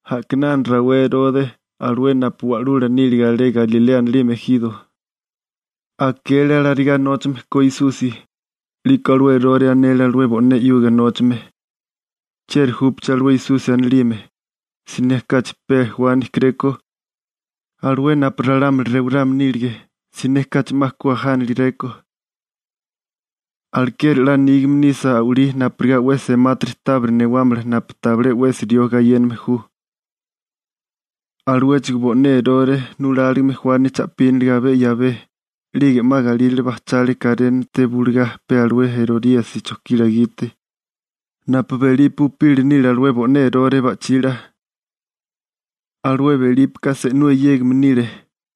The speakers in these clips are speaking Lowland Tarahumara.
A'kinana rawé Erore, alué napu wa'lula nílige alé Galilea anilime ejiro, akele alarigá nóchame ko Esusi. 'Liko alué Erore anele alué bo'né 'yuga nóchame: ―¿Chieri júpeché alué Esusi anilime? Siné kachi pe Juani kerékó, alué napu ralámuli rewarame nílige. Siné kachi 'ma ku ajánalegerékó. Alekeri 'la nígame nisa a'walí napurigá sa'wámala ralámuli napu 'ma tabile sa'wimeli nile. Aluéchigo bo'né Erore nuláligime Juani cha'píniliga abé 'yabé 'lige 'ma galírale bajchale karénate bulugá pe alué Eroríasi chojkila gite napu Belipe upila nile alué bo'né Erore ba'chila. Alué Belípeka se'nú eyégame nile.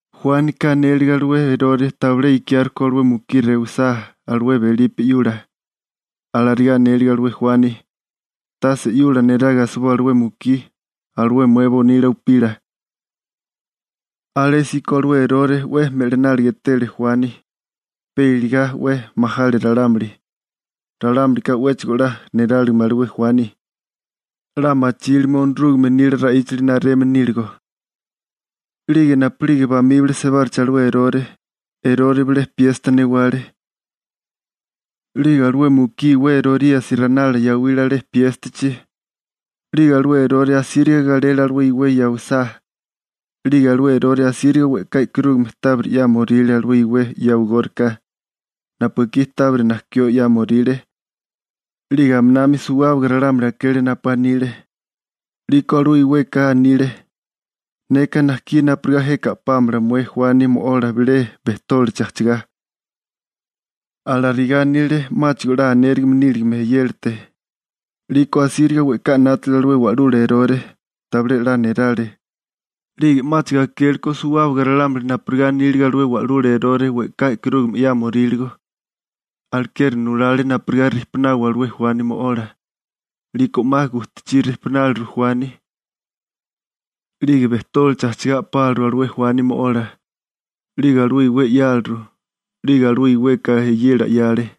Juánika anélige alué Erore tabilé ikiárekó alué mukí rewisá alué Belipe 'yula. Alarigá anélige alué Juani: ―Tase 'yula neraga asiboa alué mukí, alué mué bonila upila. Alésíko alué Erore 'we me'lináliga etele Juani, pe iligá 'we majale ralámuli. Ralámulika 'wéchigo 'la niráligime alué Juani, 'la machíligame Onorúgame nila ra'íchali nareme níligo. 'Lige napu'lige bamíbali sebárichi alué Erore, Erore bilé piesta newale. 'Lige alué mukí iwé Eroríasi ranala yawile alé piéstachi. 'Lige alué Erore asíriga galele alué iwé yawisá. 'Lige alué Erore asíriga we'ká e'karúgame tábiri 'yámoríle alué iwé yawigórika, napu ekí tábiri najkió 'yámoríle, 'lige aminami suwábaga ralámuli akele napu anile. 'Liko alué iweka anile: ―Neka najkí napurigá jeka a'pámala mué Juani mo'ola bilé bejtólichi ajchagá. Alarigá anile 'máchigo 'la anérigime níligame eyélate. 'Liko asíriga we'ká 'nátale alué wa'lula Erore. Tabilé 'la nerale, 'lige 'máchigo akéleko suwábaga ralámuli napurigá anílige alué wa'lula Erore we'ká e'karúgame 'yámoríligo. Alekeri nulale napurigá rijpunawa alué Juani mo'ola. 'Liko 'ma gujtachí rejpináleru Juani. 'Lige bejtólichi ajchigá a'páliru alué Juani mo'ola, 'lige alué iwé 'yáleru, 'lige alué iweka eyela 'yale.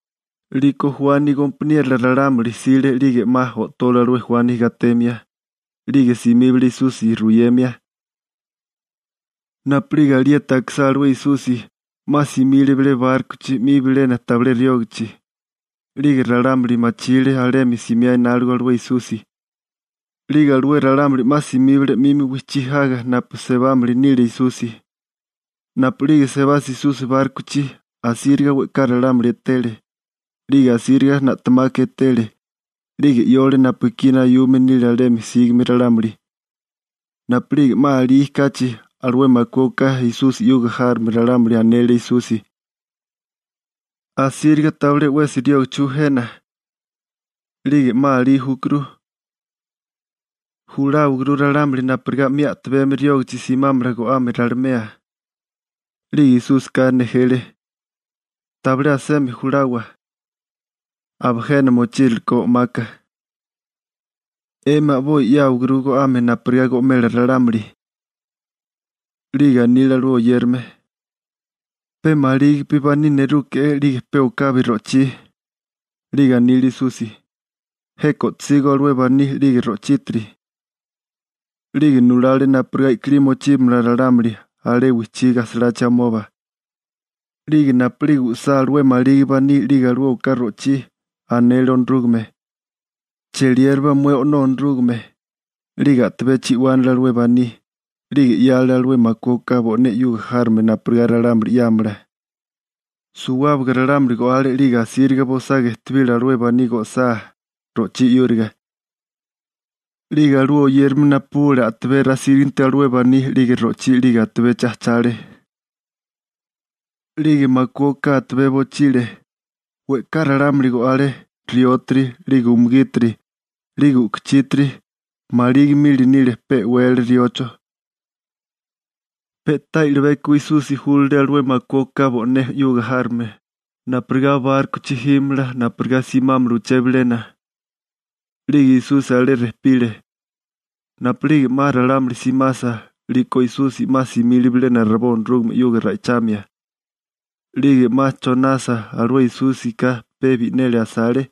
'Liko Juani gompaniérola ralámuli jsile 'lige 'ma o'tole alué Juani gatemia. 'Lige simíbale Esusi ruyemia. Napu'lige alieti akisá alué Esusi, 'ma simile bilé bárkochi 'mi bilena tabilé riógachi. 'Lige ralámuli machile alemi simiá enáligo alué Esusi, 'lige alué ralámuli 'ma simíbale 'mimi wijchí jaga napu sebámili nile Esusi. Napu'lige sebasa Esusi bárkochi, asíriga we'ká ralámuli etele, 'lige asíriga na'temaka etele, 'lige 'yole napu ekí nayume nile alemi sígame ralámuli. Napu'lige 'ma alí kachi, alué makué oká Esusi 'yuga járome ralámuli anele Esusi: ―Asíriga tabilé 'wesi riógachi ju jena. 'Lige 'ma alí júkuru. Juláwaguru ralámuli napurigá 'mi a'tabemi riógachi simámala go'ame ralimea. 'Lige Esúsika nejele: ―Tabilé asemi julawa, aba jena mochíralekó o'maka. 'Emi a'boi 'yáwaguru go'ame napurigá go'mela ralámuli. 'Lige anile alué oyérame: ―Pe malígipi baní nerúgeréke'é 'lige pe okabi ro'chí. 'Lige anile Esusi: ―Jeka o'tosígó alué baní 'lige ro'chítiri. 'Lige nulale napurigá i'kilí mochíbamala ralámuli alé wijchí gajsalachi amoba. 'Lige napu'lige u'sá alué maligi baní 'lige alué oká ro'chí, anele Onorúgame: ―Cheliérabá mué O'nó Onorúgame. 'Lige a'tabé chi'wánale alué baní. 'Lige 'yale alué makué oká bo'né 'yuga járome napurigá ralámuli 'yámala. Suwábaga ralámuli go'ale 'lige asíriga bosaga ejtebile alué baní go'sá ro'chí 'yúriga. 'Lige alué oyérame napubule a'tabé rasíriginti alué baní 'lige ro'chí 'lige atabechi ajchale. 'Lige makué oká atabé bochile. We'ká ralámuli go'ale, riótiri, 'lige umugítiri, 'lige u'kuchítiri, maligi mili nile pe e'wele riocho. Pe'tá i'libeko Esusi júlale alué makué oká bo'né 'yuga járome napurigá bárkochi jímamala napurigá simámala uché bilena. 'Lige Esúsika alé rejpile. Napu'lige 'ma ralámuli simasa, 'liko Esusi 'ma simile bilena rabó Onorúgame 'yuga ra'ichamia. 'Lige 'ma chonasa, alué Esúsika pe bi'neli asale.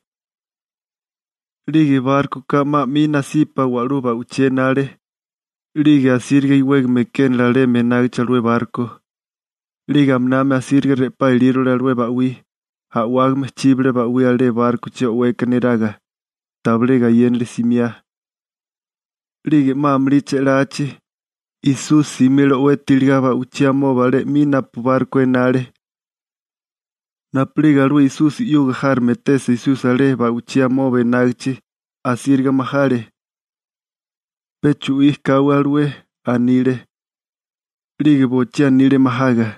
'Lige bárkoka 'ma 'mi nasipa wa'lú ba'wichí enale, 'lige asíriga iwégame ekénale alemi enágichi alué barko. 'Lige aminami asíriga re'pá ilírole alué ba'wí, a'wágame chíbale ba'wí alé bárkochi o'weka neraga. Tabilé gayénale simiá. 'Lige 'ma amulí che'lachi, Esusi simile o'weti iligá ba'ichí amoba alé 'mi napu barko enale. Napu'lige alué Esusi 'yuga járome etesa Esusi alé ba'ichí amoba enágichi, asíriga majale. ―¡Pe chu'í káwé alué! ―anile. 'Lige bochí anile majaga.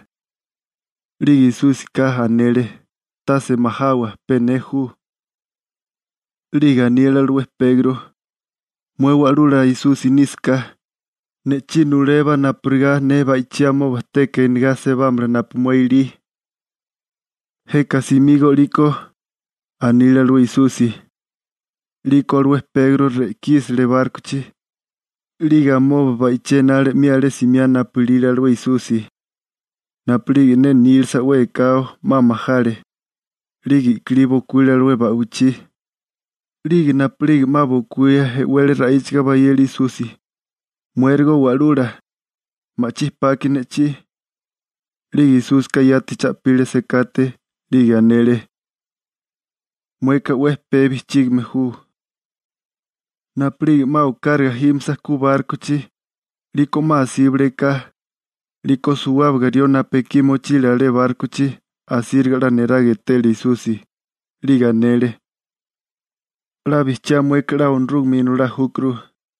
'Lige Esúsika anele: ―¡Tase majawa, pe ne ju! 'Lige anile alué Pegro: ―Mué Wa'lula Esusi nísaká, ne'chí nulébá napurigá ne ba'ichí amoba teka enegá sebámala napu mué ilí. ―Jeka simígó 'liko ―anile alué Esusi. 'Liko alué Pegro re'kísele bárkochi, 'lige amoba ba'ichí enale 'mi alé simiá napu ilile alué Esusi. Napu'lige ne nílasa 'we ekao, 'ma majale. 'Lige i'kilí bokuíle alé ba'wichí, 'lige napu'lige 'ma bokuía, e'wele ra'íchaga bayele Esusi: ―¡Muérigo Wa'lula, ma'chí paki ne'chí! 'Lige Esúsika yati cha'pile sekate, 'lige anele: ―¡Mueka 'we pee bijchígame ju! Napu'lige 'ma okáraga jímasa ku bárkochi, 'liko 'ma asíbale eká. 'Liko suwábaga rió napu ekí mochílige alé bárkochi, asíriga 'la neraga etele Esusi, 'lige anele: ―'La bijchiá mueka 'la Onorúgame Inolá júkuru.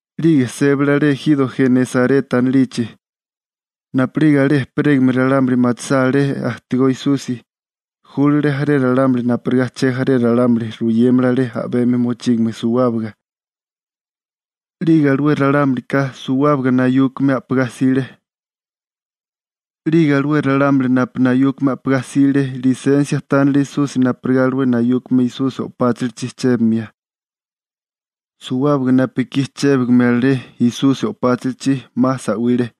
'Lige sébale alé ejiro Genesareta anilichi. Napu'lige alé ejperégame ralámuli machisá alé ajtigó Esusi, júlale jaré ralámuli napurigá chejaré ralámuli ruyémala alé a'bemi mochígame suwábaga. 'Lige ralámulika suwábaga nayúkame a'pagá jsile. 'Lige alué ralámuli napu nayúkame a'pagá jsile lisensia tánele Esusi napurigá alué nayúkame Esusi o'páchilichi chébimia. Suwábaga napu ekí chébale alé Esusi o'páchilichi, 'ma sa'wile.